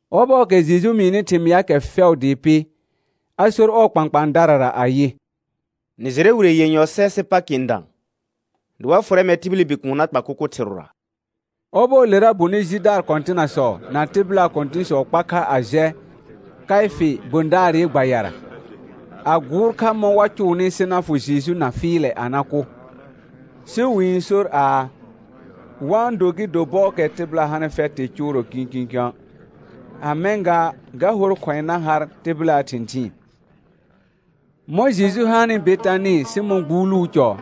Ɔbɔɔkɛ Jeju mɩɩnɩ thɩmɩaakɛ fɛʋ dɩɩ pɩ, a sor ɔɔ kpãkpãadarara ayɩ: Nɩ jɩrɛ wire yenyɔ sɛ sɩ Pakɩ n dã, dɩ wa fʋrɛ mɛr tibili Bikuun na kpa kʋkʋ thɩrʋra. Ɔbɔɔlera bonɩ jidaar kɔ̃tɩnasɔ na tɩbɩlaa kɔ̃tɩ̃sɔ kpa kha a jɛ Kaɩfɩ gbõdaarɩ gbayara, a gʋʋr kha mɔ̃ wa cʋʋnɩ sɩ na fʋ Jeju na fɩɩlɛ a na kʋ. Sɩ wɩ-n sor aa, wa-n do gɩ do bɔɔkɛ tɩbɩla hanɩ fɛtɩ cʋʋrɔ kĩkĩkə̃', a mɛ̃ gaa ga hor khʋ̃ɛ na har tɩbɩlaa thɩ̃thɩɩn. Mɔ̃ Jeju hanɩ Betanɩ Sɩmɔ̃ gbuuluu cɔ,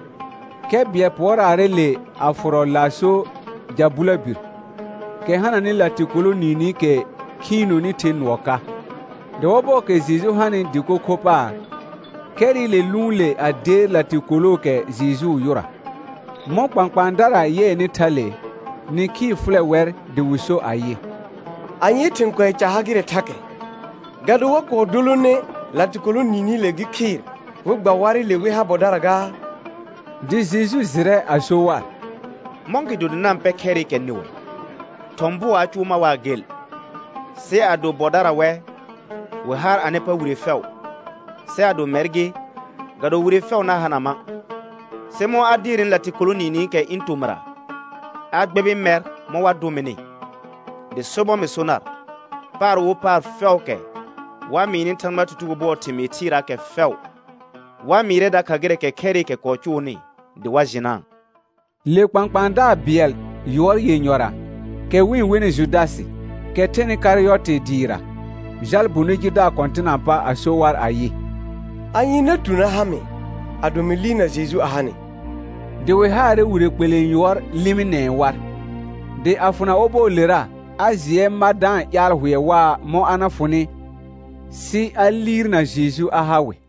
khɛ bɩɛl pʋɔraarɛ le a fʋrɔ laaso ja bʋlabir, kɛ hananɩ latɩkolo niinikɛ khiinoni the nʋɔ ka. Dɩ ɔbɔɔkɛ Jeju hanɩ dɩko kho paar, khɛrɩle lʋʋn le a deer latɩkolookɛ Jejuu yʋra. Mɔ̃ kpãkpãadara yɩɛnɩ thale, nĩkhii fʋlɛ wɛr dɩ wɩ so ayɩ: Anyee thɩ̃ kʋɛ ca ha gɩrɛ thakɛ? Ga do wa kɔɔ dolone latɩkolo niinile gɩ khɩɩr, wɩ gba warɩle wɩ ha bɔdara gaa? Dɩ Jeju jɩrɛ a so war: Mɔ̃gɩdo dɩ na-n pɛ khɛrɩkɛ nɩwɛ? Thɔ̃ bʋɔ a cʋʋ mar waa gel. Sɩ ado bɔdara wɛ, wɩ har anɩ pa wire fɛʋ, sɩ ado mɛr gɩ, ga do wire fɛʋ na hana ma'. Sɩ mɔ̃ a deernɩ latɩkolo niinikɛ ɩ̃ tomɩra, a gbɛbɩ mɛr mɔ̃ wa dʋ mɩnɩ. Dɩ sobɔr mɩ so nar, paar fɛʋʋkɛ wa-n mɩɩnɩ Thãgbaa tutugo bʋɔɔ thɩmɩɩ thɩɩraakɛ fɛʋ, wa-n mɩɩrɛ dakha gɩrɛɛkɛ khɛrɩkɛ kɔɔ cʋʋnɩ dɩ wa jɩnaa. Le kpãkpãadaar bɩɛl yʋɔr yenyɔra, kɛ wɩ-n wenɩ Judasɩ, kɛ thɛnɩ Karɩyɔtɩ dɩɩra, jal bonɩ jidaar kɔ̃tɩnaa pa a so war ayɩ: Anye na tu na ha mɩ, ado mɩ liirna Jeju a ha nɩ? Dɩ wɩ haarɛ wire kpelẽ yʋɔr lɩmɩnɛɛ war. Dɩ a fʋna ɔbɔɔlera, a jɩɛ ma da-n ƴaal hʋɛ waa mɔ̃ a na fʋnɩ sɩ aliirna Jeju a ha wɩ.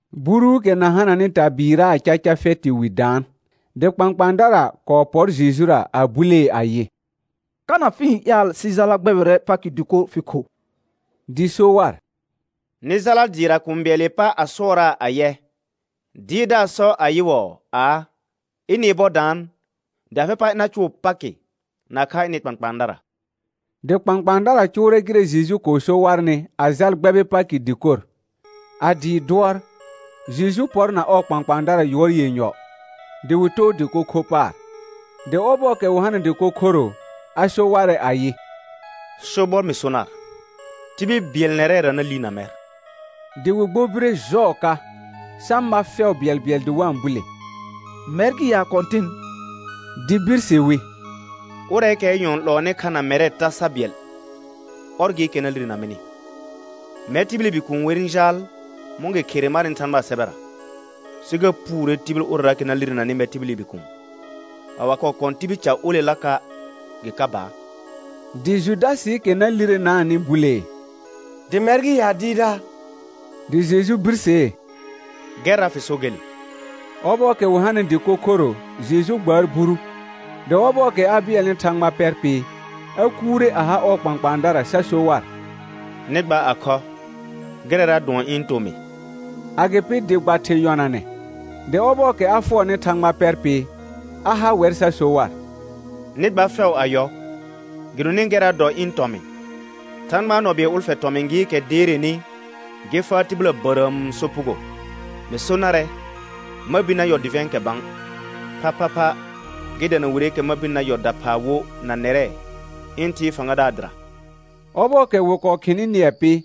Buruukɛ na hananɩ tabɩɩraa caca fɛtɩ wi daan, dɩ kpãkpãadara kɔɔ pɔr Jejura a bulee ayɩ: Kana fɩ-n ƴaal sɩ jala gbɛbɩrɛ Pakɩ dɩkor fɩ kho? Dɩ so war: Nɩ jala dɩɩra kũu bɩɛlɩ pa a sʋɔraa ayɛ: Dɩɩrdaar sɔ ayɩwɔɔ aa, ɩnɩ bɔ daan, dɩ afɩ pa ɩna cʋʋ Pakɩ nakha ɩnɩ kpãkpãadara. Dɩ kpãkpãadara cʋʋrɛ gɩrɛ Jeju kɔɔ so warnɩ a jal gbɛbɩ Pakɩ dɩkor. A dɩɩ dʋɔr, Jeju pɔr na ɔɔ kpãkpãadara yʋɔr yenyɔ, dɩ wɩ too dɩko kho paar. Dɩ ɔbɔɔkɛ wɩ hanɩ dɩko khoro, a so warɛ ayɩ: Sobɔr mɩ so nar, tibil bɩɛl nɛrɛra na liirna mɛr. Dɩ wɩ gbobire jɔɔ ka, sa ma fɛʋ bɩɛlbɩɛl dɩ wa-n bule: Mɛr gɩ ya Kɔ̃tɩn? Dɩ birse wi: Ʋrɛɛkɛɛ nyɔ̃ n 'lɔɔnɩ kha na mɛrɛ tasa bɩɛl, ɔr gɩɩkɛ na lirena mɩnɩ. Mɛr tibili Bikuun wer n jaal mɔ̃ gɩ khere marnɩ Thãgbaa sɛbɛra, sɩ ga puure tibil ʋrɛraakɛ na lirenanɩ mɛr tibili Bikuun. A wa kɔɔ kɔ̃ tibil ca olelaka', gɩ ka baar. Dɩ Judasɩɩkɛ na lirenaanɩ bulee: Dɩ mɛr gɩ ya Dɩɩrdaar? Dɩ Jeju birsee: Gɛrra fɩ so gele. Ɔbɔɔkɛ wɩ hanɩ dɩko khoro Jeju gbaar buru, dɩ ɔbɔɔkɛ a bɩɛlnɩ Thãgba pɛr pɩ, a kuure a ha ɔɔ kpãkpãadara sa so war: Nɩ gba a khɔ, gɩrɛra dʋɔn ɩ̃ tomɩ. Agɩpɩ dɩ gba thɩ̃ yɔnanɛ, dɩ ɔbɔɔkɛ a fʋɔrnɩ Thãgba pɛr pɩ, a ha wɛr sa so war: Nɩ gba fɛʋ a yɔ. Gɩdonɩ gɛrra dɔ ɩ̃ tɔmɩ̃, Thãgbaa nɔ bɩɛl ʋlfɛ tɔmɩ̃ gɩɩkɛ deerenɩ gɩ faa tɩbɩla bərəəm sopugo. Mɩ so narɛ ma bir na yɔ dɩvɛ̃ɛkɛ bã, phaphapha gɩ dana wireekɛ ma birni na yɔ daphaa wo na nɛrɛ ɩ̃ Thɩɩ fãgadaar dɩra. Ɔbɔɔkɛ wɩ kɔɔ khɩnɩ nɩɛ pɩ,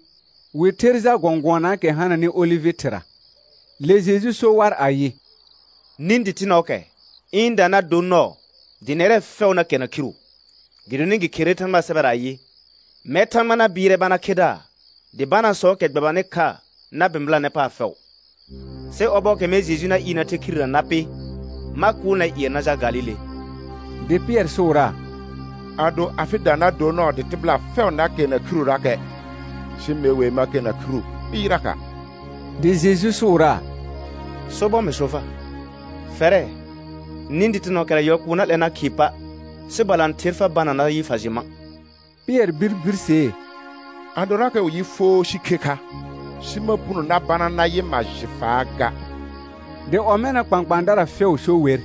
wɩ ther jal gɔ̃gʋɔnaakɛ hananɩ olɩvɩ thɩra. Le Jeju so war ayɩ: Nĩ dɩtɩnɔɔkɛ ɩ̃da na dor nɔɔ dɩ nɛrɛ fɛʋ na kɛrna khiru, gɩdonɩ gɩ kherere Thãgbaa sɛbɛra ayɩ: «Mɛr Thãgba na bɩɩrɛ bana khedaar, dɩ banaasɔɔkɛ gbɛbanɩ kha na bɩ̃bɩlanɛ paar fɛʋ.» Sɩ ɔbɔɔkɛ mɛr Jeju na ɩɩrnɩ na the khirera na pɩ, ma kʋʋl nɛr ƴɩɛ na jal Galile. Dɩ Pɩɛr sʋʋraa: Ado afɩda na dor nɔɔ dɩ tɩbɩla fɛʋ na kɛrna khirurakɛ, sɩ me wer ma kɛrna khiru kpɩɩraka'. Dɩ Jeju sʋʋraa: Sobɔr mɩ so far, fɛrɛ, nĩ dɩtɩnɔɔkɛra yɔl kʋʋ na 'lɛ na khɩɩ pa', sɩ balãther fa bana nayɩ fa jɩ ma'. Pɩɛr bir birsee: Adorakɛ wɩ yɩ foo sɩ khe kha, sɩ ma puno na bana nayɩ ma jɩ faa ga. Dɩ ɔmɛna kpãkpãadara fɛʋ so wer.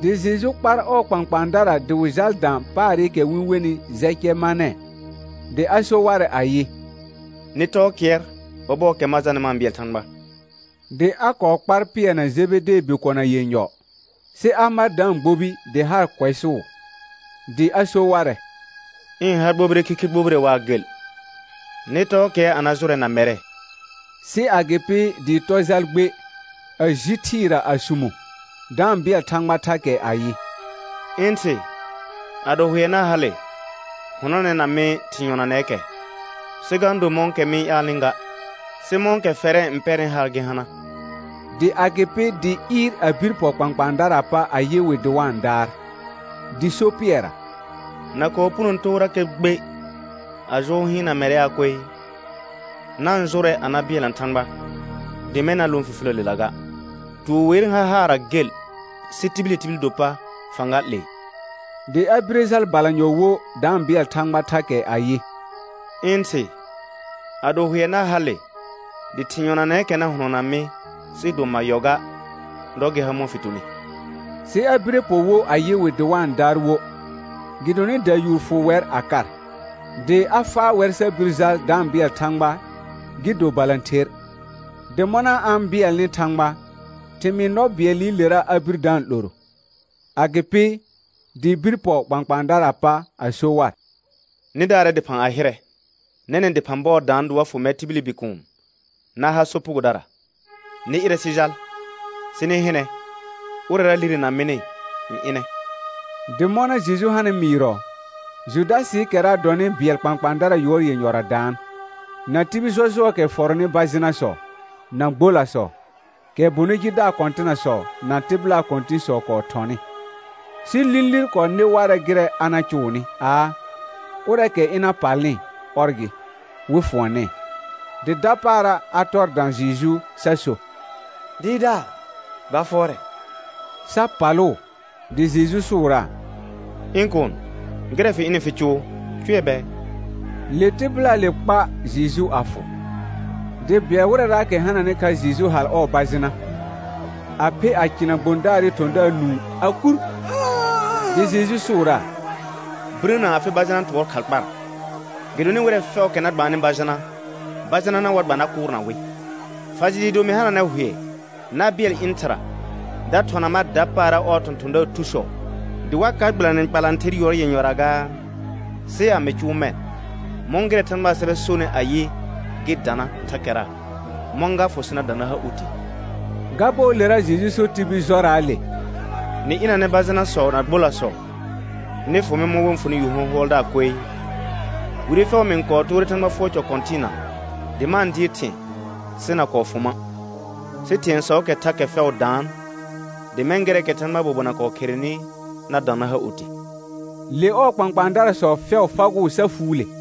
Dɩ Jeju kpar ɔɔ kpãkpãadara dɩ wɩ jal da paarɩkɛ wɩ-n wenɩ Jɛcɛmanɛ, dɩ a so warɛ ayɩ: Nɩ tɔɔ kɩɛr ɔbɔɔkɛ ma jalnɩ ma-n bɩɛl Thãgba. Dɩ a kɔɔ kpar Pɩɛr na Jebedee bikona yenyɔ, sɩ a mar da-n gbobi dɩ haar kʋɛsʋʋ. Dɩ a so warɛ: ɩ̃ ha gbobire khikhi gbobire waa gel. Nɩ tɔɔ kɩɛr a na jʋrɛ na mɛrɛ. Sɩ agɩpɩ dɩ tɔ jal gbe, a ji thɩɩra a sumo, da-n bɩɛl Thãgba thakɛ ayɩ: ɩ̃ Thɩ, ado hʋɛ na hale, hʋnɔnɛna mɩ thɩ̃ yɔnanɛɛkɛ, sɩ ga-n do mɔ̃kɛ mɩ-n ƴaalnɩ ga, sɩ mɔ̃kɛ fɛrɛ n pɛrnɩ haar gɩ hana. Dɩ agɩpɩ dɩ ɩɩr a bir pɔ kpãkpãadaraa pa a yɩ wɩ dɩ wa-n daar, dɩ so Pɩɛrra: Na kɔɔ puno toorakɛ gbe a jʋʋr hɩɩn na mɛrɛaa koe? Na-n jʋrɛ a na bɩɛlna Thãgba, dɩ mɛ̃ na lõ fifiləlela ga. Tuur wer n har haarra gel, sɩ tibili tibil do pa fãga 'lee. Dɩ a bire jal balanyɔ wo da-n bɩɛl Thãgba thakɛ ayɩ: Ɩ̃ Thɩ, ado hʋɛ na hale, dɩ thɩ̃ yɔnanɛɛkɛ na hʋnɔna mɩ sɩɩ do ma yɔ ga, dɔ gɩ ha mɔ̃ fɩ tuni. Sɩ a bire pɔ wo a yɩ wɩ dɩ wa-n daar wo, gɩdonɩ dayuur fʋ wɛr a kar. Dɩ a faa wɛr sa bir jal da-n bɩɛl Thãgba gɩ do balãther; dɩ mɔna a-n bɩɛlnɩ Thãgba, thɩmɩɩ nɔ bɩɛlɩlera a bir da-n 'loro. Agɩpɩ dɩ bir pɔ kpãkpãadaraa pa a so war: Nɩ daarɛ dɩphã a hɩrɛ. Nɛnɛ̃ dɩphã bɔɔ daan dɩ wa fʋ mɛr tibili Bikuun na ha sopugodara. Nɩ ɩrɛ sɩ jal, sɩ nɩ hɩnɛ ʋrɛra lirena mɩnɩ n ɩnɛ. Dɩ mɔna Jeju hanɩ mɩɩrɔ, Judasɩɩkɛra dɔnɩ bɩɛl kpãkpãadara yʋɔr yenyɔra daan, na tibil jɔjʋɔɔkɛ fɔrɔnɩ bajɩnasɔ, na gbolasɔ, kɛ bonɩ jidaar kɔ̃tɩnasɔ na tɩbɩlaa kɔ̃tɩ̃sɔ kɔɔ thɔnɩ. Sɩ lĩlir kɔɔ nɩ warɛ gɩrɛ a na cʋʋnɩ aa, ʋrɛɛkɛ ɩna palnɩ, ɔr gɩ, wɩ fʋɔnɛɛ. Dɩ dapaara a tɔr dã Jeju sa so: Dɩɩrdaar, gba fʋɔrɛ; sa palʋʋ. Dɩ Jeju sʋʋraa: Ɩ̃ kuun, gɩrɛ fɩ ɩnɩ fɩ cʋʋ, cʋɛ bɛɛ. Le tɩbɩlaale kpa Jeju a fʋ. Dɩ bɩɛl wɩrɛraakɛ hananɩ kha Jeju hal ɔɔ bajɩna, a phe a cɩna gbõdaarɩ thɔ̃daar nũu a kur. Dɩ Jeju sʋʋraa: Birəna afɩ bajɩna tʋɔr khal kpara, gɩdonɩ wɩrɛ fɛʋʋkɛ na gbaannɩ bajɩna, bajɩnana wa gba na kʋʋrna wɩ. Fa jɩ dɩɩ do mɩ hananɛ hʋɛ na bɩɛl ɩ̃ Thɩra da thɔna mar dapaara ɔɔ thɔ̃thɔ̃daar thusɔ, dɩ wa ka gbɩlanɩ kpalãther yʋɔr yenyɔra gaa? Sɩ a mɩ cʋʋ mɛ̃, mɔ̃ gɩrɛ Thãgbaa sɛbɛ sonɩ ayɩ: Gɩ dana thakɛra, mɔ̃ ga fʋ sɩ na dã na ha oti? Ga bɔɔlera Jeju so tibil jɔraale: Nɩ ɩnanɛ bajɩnasɔ na gbolasɔ, nɩ fʋ mɩ mɔ̃ wɩ-n fʋnɩ yu hɔ̃hʋɔldaar koe. Wire fɛʋ mɩ-n kɔɔ toore Thãgba fʋɔr cɔ kɔ̃tɩɩna dɩ ma-n dɩɩr thɩ̃ɛ, sɩ na kɔɔ fʋ ma'. Sɩ thɩ̃ɛsɔɔkɛ thakɛ fɛʋ daan, dɩ mɛ̃ gɩrɛɛkɛ Thãgbaa bobona kɔɔ kherenɩ na dã na ha oti. Le ɔɔ kpãkpãadarasɔ fɛʋ fagʋʋ sa fuule.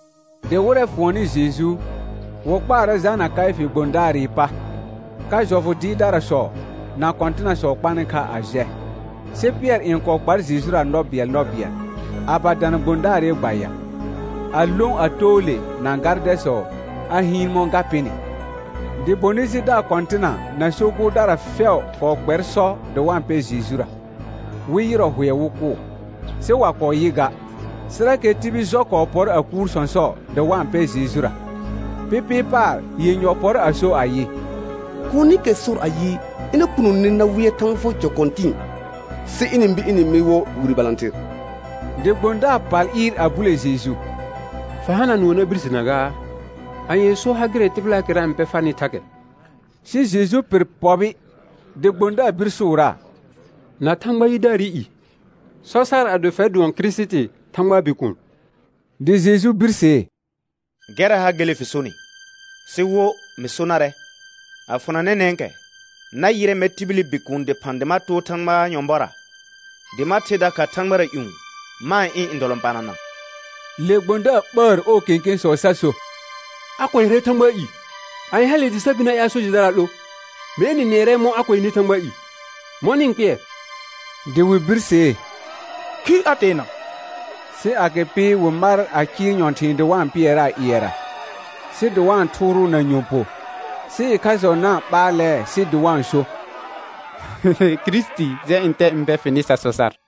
Dɩ wɩrɛ fʋɔnnɩ Jeju, wɩ kpaarɛ jalna Kaɩfɩ gbõdaarɩ pa, ka jɔfʋ dɩɩrdarasɔ na kɔ̃tɩnasɔ kpanɩ kha a jɛ. Sɩ Pɩɛr n kɔɔ kpar Jejura nɔ bɩɛl nɔ bɩɛl, a ba dana gbõdaarɩ gbaya, a lõ a too le na gardɛsɔ a hɩɩn mɔ̃ ga pɩnɩ. Dɩ bonɩ jidaar kɔ̃tɩna na so gʋʋrdara fɛʋ kɔɔ kpɛr sɔ dɩ wa-n pɛ Jejura, wɩ yɩrɔ hʋɛ wɩ kʋʋ. Sɩ wa kɔɔ yɩ ga, sɩrakɛ tibil jɔ kɔɔ pɔr a kuur sɔ̃sɔ dɩ wa-n pɛ Jejura. Pɩpɩɩ paar yenyɔ pɔr a so ayɩ: Kuunikɛ sor ayɩ, ɩna punone na wɩɛr Thãgba fʋɔr cɔ kɔ̃tɩ̃ɩ, sɩ ɩnɩ-n bir ɩnɩ-n mɩ wo wire balãther. Dɩ gbõdaar pal ɩɩr a bule Jeju: Fa hana nʋɔ na birsena gaa? Anyee so ha gɩrɛ tɩbɩlaakɛra n pɛ farnɩ thakɛ? Sɩ Jeju pɩr pɔbɩ, dɩ gbõdaar bir sʋʋraa: Na Thãgba yidaarɩ i, sɔ sar ado fɛr dʋɔn Kirisiti Thãgbaa Bikuun. Dɩ Jeju birsee: Gɛrra ha gele fɩ sonɩ, sɩ wo mɩ so narɛ, a fʋna nɛnɛ̃kɛ na yɩrɛ mɛr tibili Bikuun dɩphã dɩ ma too Thãgbaa nyɔ̃bɔra, dɩ ma ther dakha thãgbara ƴũ ma-n ɩ̃ ndɔlɔ̃panana. Le gbõdaar ɓəər ɔɔ kẽkẽsɔ sa so: A kʋɛrɛ Thãgbaa i. Anye hale dɩ sa bir na ƴaal so jɩdara 'lo? Mee nɩ nɩɛrɛ mɔ̃ a kʋɛnɩ Thãgbaa i, mɔ̃ nɩ-n kpɩɛr? Dɩ wɩ birsee: Khir a teena. Sɩ agɩpɩ wɩ mar a cɩɩr nyɔ̃thɩ̃ɩ dɩ wa-n pɩɛraa ƴɩɛra, sɩ dɩ wa-n thʋʋrʋʋ na nyɔ̃ po, sɩ ɩkhasɔ na-n ɓaalɛɛ sɩ dɩ wa-n so: Kirisiti, jɛ ntɛsɔ n bɛ fɩnɩ sa sɔ sar.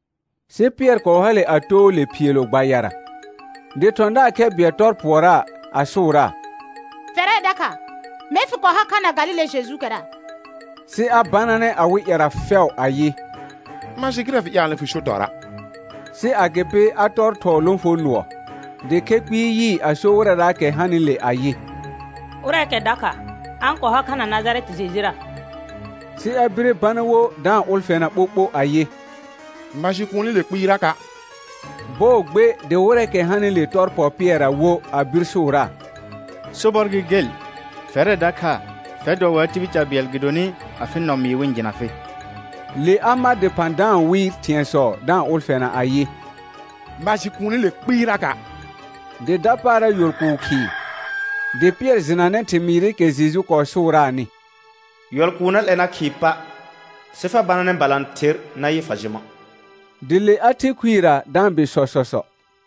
Sɩ Pɩɛr kɔɔ hale a too le phiilo gbayara. Dɩ thɔ̃daar khɛ bɩɛl tɔr pʋɔraa a sʋʋraa: Fɛrɛ dakha, mee fɩ kɔɔ har kha na Galile Jejuukɛra. Sɩ a bananɛ awɩ ƴɛra fɛʋ ayɩ: Ma jɩ gɩrɛ fɩ-n ƴaalnɩ fɩ so tɔra'. Sɩ agɩpɩ a tɔr thɔɔ lõfonʋɔ, dɩ khɛ kpɩɩ yɩɩ a so wɩrɛraakɛ hanɩle ayɩ: Ʋrɛɛkɛ dakha, a-n kɔɔ har kha na Najarɛtɩ Jejura. Sɩ a bire bana wo da-n ʋlfɛna ɓoɓo ayɩ: Ma jɩ kuunile kpɩɩraka'. Bɔɔ gbe dɩ wɩrɛɛkɛ hanɩle tɔr pɔ Pɩɛrra wo a bir sʋʋraa: Sobɔr gɩ gel, fɛrɛ dakha fɛr dɔ waa tibil ca bɩɛl, gɩdonɩ afɩ nɔ mɩɩ wɩ-n jɩna fɩ. Le a ma dɩphã da-n wɩɩr thɩ̃ɛsɔ da-n ʋlfɛna ayɩ: Ma jɩ kuunile kpɩɩraka'. Dɩ dapaara yɔl kʋʋ khɩɩ, dɩ Pɩɛr jɩnanɛ thɩmɩɩrɩkɛ Jeju kɔɔ sʋʋraanɩ: Yɔl kʋʋ na 'lɛ na khɩɩ pa', sɩ fa bananɛ balãther nayɩ fa jɩ ma'. Dɩ le a the khuirə da-n bɩ sɔsɔsɔ.